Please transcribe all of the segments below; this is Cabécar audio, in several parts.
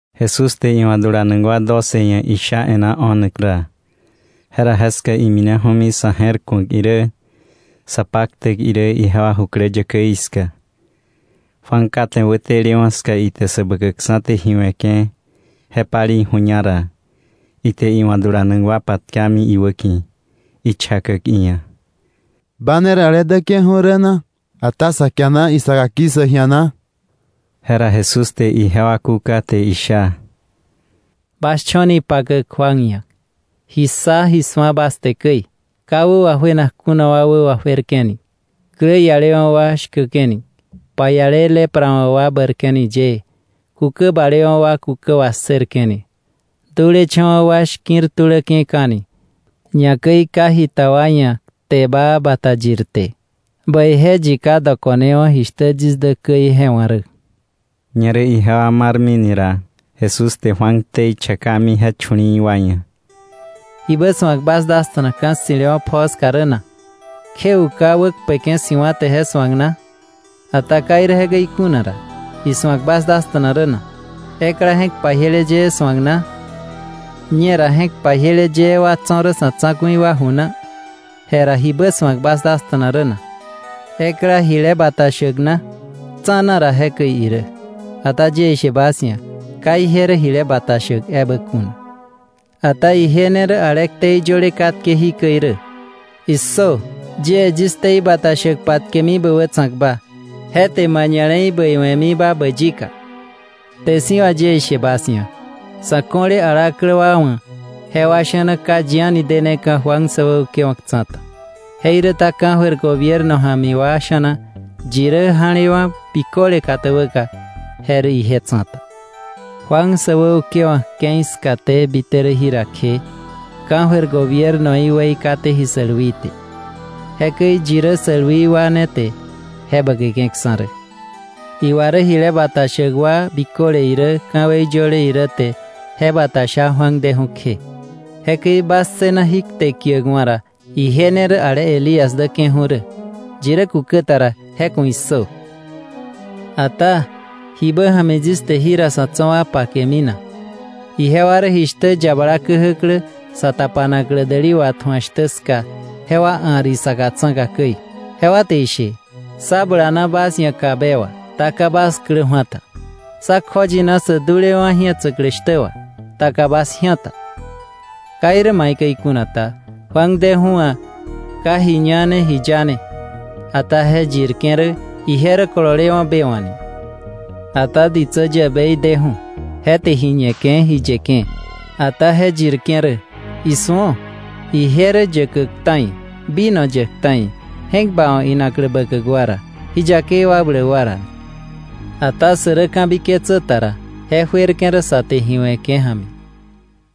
Jesús te iwa̱ dulanak wa doce ia̱ isha e̱ná o̱nak ra, jera jeska imineju̱mi sa̱ je̱r ku̱ak irä, sa paktäk irä, ijewa jukläyäkäí ska. Juan kate wätelewa̱ ska ite Säbäkäkksa̱ te ji we̱ke̱ je palei ju̱ña ra, ite iwa̱ dulanak wa patkami iwäki̱, ichakäk iia̱: —¿Ba ne rä ale däke̱ju̱ rä na, ata sa kiana isaka ki̱ssäk ji̱a na? Jera Jesús te ijewa kúka te isha: —Bas cho̱ni ipakäk Juan ia̱, ji ssa, ji su̱a, bas te käi: ka wä wajuenak kuna wa wä wajuerke̱ni, klä ialewa̱ wa shkäke̱ni, paiale lepra wa̱ wa bäirke̱ni yëë, kukä balewa̱ wa kukä wassërke̱ni, dulecha̱wa̱ wa shki̱r tuläke̱ka̱ni, ñakäi ka jita wa ia̱ kte baa bata yirte. ¡Bäije yi ka dokonewa̱ jishtä yis dä käi je wa̱ rä! Ñerä ijewa marmini ra, Jesús te Juan ktei chakami je chu̱li̱i̱ wa ia̱: “¿Jibä su̱ak bas dasta̱na ka̱ ssi̱lewa̱ pjoo ska rä na? ¿Kje uka wäkpeke̱ si̱wa̱ te je su̱ak na? Ata ka irä jekäi kuna ra, ¿ji su̱ak bas dasta̱na rä na? ¿Ekla je̱k pajiele yëë su̱ak na? Ñera, je̱k pajiele yëë wa tso̱ rä sa̱ tsa̱ku̱i wa ju na. Jera, ¿jibä su̱ak bas dasta̱na rä na? ¿Ekla jile bata shäk na? Tsa̱na ra jekäi irä, ata yie ishe bas ia̱, ka ije rä jile bata shäk ebä kuna. Ata ije ne rä ale ktei yöle katke jikäi rä: ‘¡Issö! Yie yis ktei bata shäk patkemi bä wätsa̱kba. Je te ma ña̱le̱i bäiwe̱miba bä yika.’ Kte si̱ wà yie ishe bas ia̱, sa̱ ko̱le alaklä wa wa̱, jewa sha̱na ka yi deneka̱ Juan säwäukewa̱k tsa̱ta; jeiräta ka̱jöir gobierno ja̱mi wa sha̱na yi rä ja̱lewa̱ biköle katäbäka, je rä ije tsa̱ta. “Juan säwäukewa̱k ke̱i skaté bite rä jira kje, ka̱jöir gobiernoí weikaté ji sälwii te; jekäi yi rä sälwi wa ne te je bäkeke̱ksa̱ rä. Iwa rä jile bata shäk wa biköle irä ka̱wei yöle irä te je bata sha Juan deju̱ kje. Jekäi bas ssëna jí kte kiäkwa̱ ra, ije ne rä ale Elías däke̱ju̱ rä. Yi rä kukä ta ra, ¡je ku̱ issö! “Ata ¿jibä ja̱mi yis te jira sa̱ tso̱ wa pakemi na? Ijewa rä jishtä yabala käjäklä sa tapanaklä däli watju̱ak shtä ska, jewa a̱r isaka tsa̱ka käi, jewa te ishe: ‘Sá bulana bas ia̱ kabe wà, ta ka bas klä ju̱a ta; sá kjoyina sä dulewa̱ ji̱etsäklä shtä wà, ta ka bas ji̱á ta.’ Ka irä maikäi kuna ta, Juan deju̱ wa̱ ka ji ñane, ji yane, ata je yirke̱ rä: ‘Ije rä kololewa̱ be wa̱’ ni. Ata ditsä yäbei deju̱, je te ji ñeke̱, ji yeke̱, ata je yirke̱ rä: ‘Isu̱o, ije rä yäkäk ta̱i, vino yäk ta̱i, je̱k bawa̱k inaklä bäkäk wa ra, ji yakei wakbläk wa ra’ ni. Ata sä rä ka̱biketsä ta ra, je juerke̱ rä sä te ji we̱ke̱ ja̱mi.”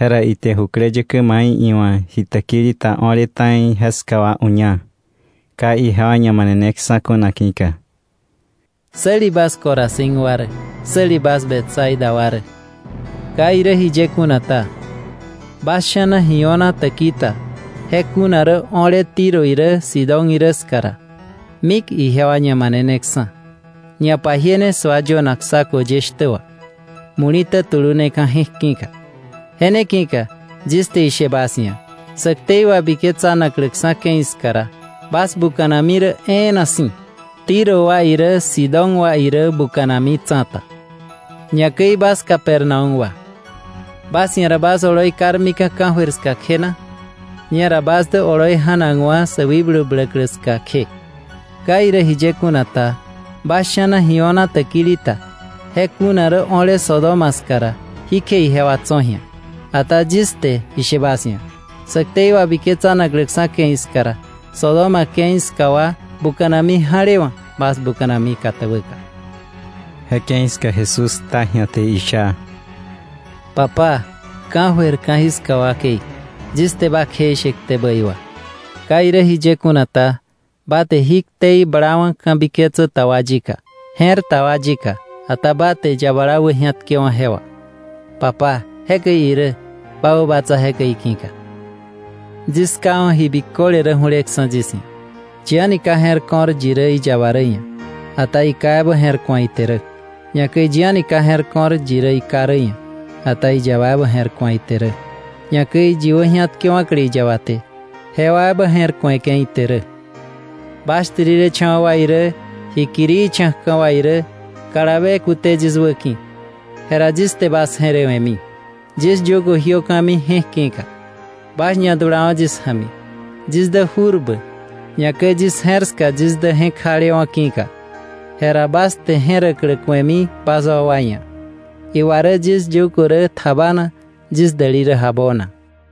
Jera ite jukläyäkä mai iwa̱ ji täkili ta o̱le ta̱i ska wa uña, ka ijewa ñamaneneksa̱ kuna ki̱ka: “¡Säli bas Corazín wa rä! ¡Säli bas Betsaida wa rä! Ka irä jiye kuna ta, bas sha̱na ji o̱na täkili ta je kuna rä o̱le Tiro irä Sidón irä ska ra, mik ijewa ñamaneneksa̱, ñapajiene sua yönak saco ye shtä wà, muli̱tä tulune je̱k ki̱ka. Je ne ki̱ka yis te ishe bas ia̱, sä ktei wabiketsanakläksa̱ ke̱i ska ra, bas buka̱nami rä e̱e̱na si̱, Tiro wa irä Sidón wa irä buka̱nami tsa̱ta. Ñakäi bas Capernaúm wa, ¿bas ia̱ ra bas oloi karmika̱ ka̱jöir ska kje na? Ñera bas dä oloi ja̱nakwa̱ sä wikblu bläklä ska kje. Ka irä jiye kuna ta, bas sha̱na ji o̱na täkili ta je kuna rä o̱le Sodoma ska ra, ji kje ijewa tso̱ ji̱a. Ata yis te ishe bas ia̱, sä ktei wabiketsanakläksa̱ ke̱i ska ra, Sodoma ke̱i ska wa buka̱nami ja̱lewa̱ bas buka̱nami katäbäka.” Je ke̱i ska Jesús kta ji̱a te isha: “Papá, ka̱jöir ka̱jiska wakei, yis te ba kjeishe kte bäi wà. Ka irä jiye kuna ta, ba te jí ktei blawa̱ ka̱biketsä ta wa yika, je̱r ta wa yika, ata ba te yabala wäji̱atkewa̱ je wà. Papá, jekäi irä, ba wäbatsa jekäi ki̱ka. “Yis Ká wa̱ ji biköle rä ju̱leksa̱ yis ia̱. Yi a̱ni ka je̱r ko̱r iyaba ia̱, ata iKá ebä je̱r ku̱a ite rä. Ñakäi yi a̱ni ka je̱r ko̱r iKá ia̱, ata iyaba ebä je̱r ku̱a ite rä, ñakäi yi wäji̱atkewa̱kle iyaba te, jewa ebä je̱r ku̱eke̱ ite rä. Bas shtirilecha̱wa̱ wa irä, ji kirii cha̱kka̱ wa irä, kalabe kute yis wäki̱, jera yis te bas je̱rewe̱mi. Yis yugo jiöka̱mi je̱k ki̱ka, bas ñadulawo̱ yis ja̱mi; yis dä jurbä, ñakäi yis je̱r ska yis dä je̱k jalewa̱ ki̱ka. Jera bas te je̱räklä ku̱emi bas wakwa ia̱. Iwa rä yis yugo rä tjabana, yis däli rä jabona.”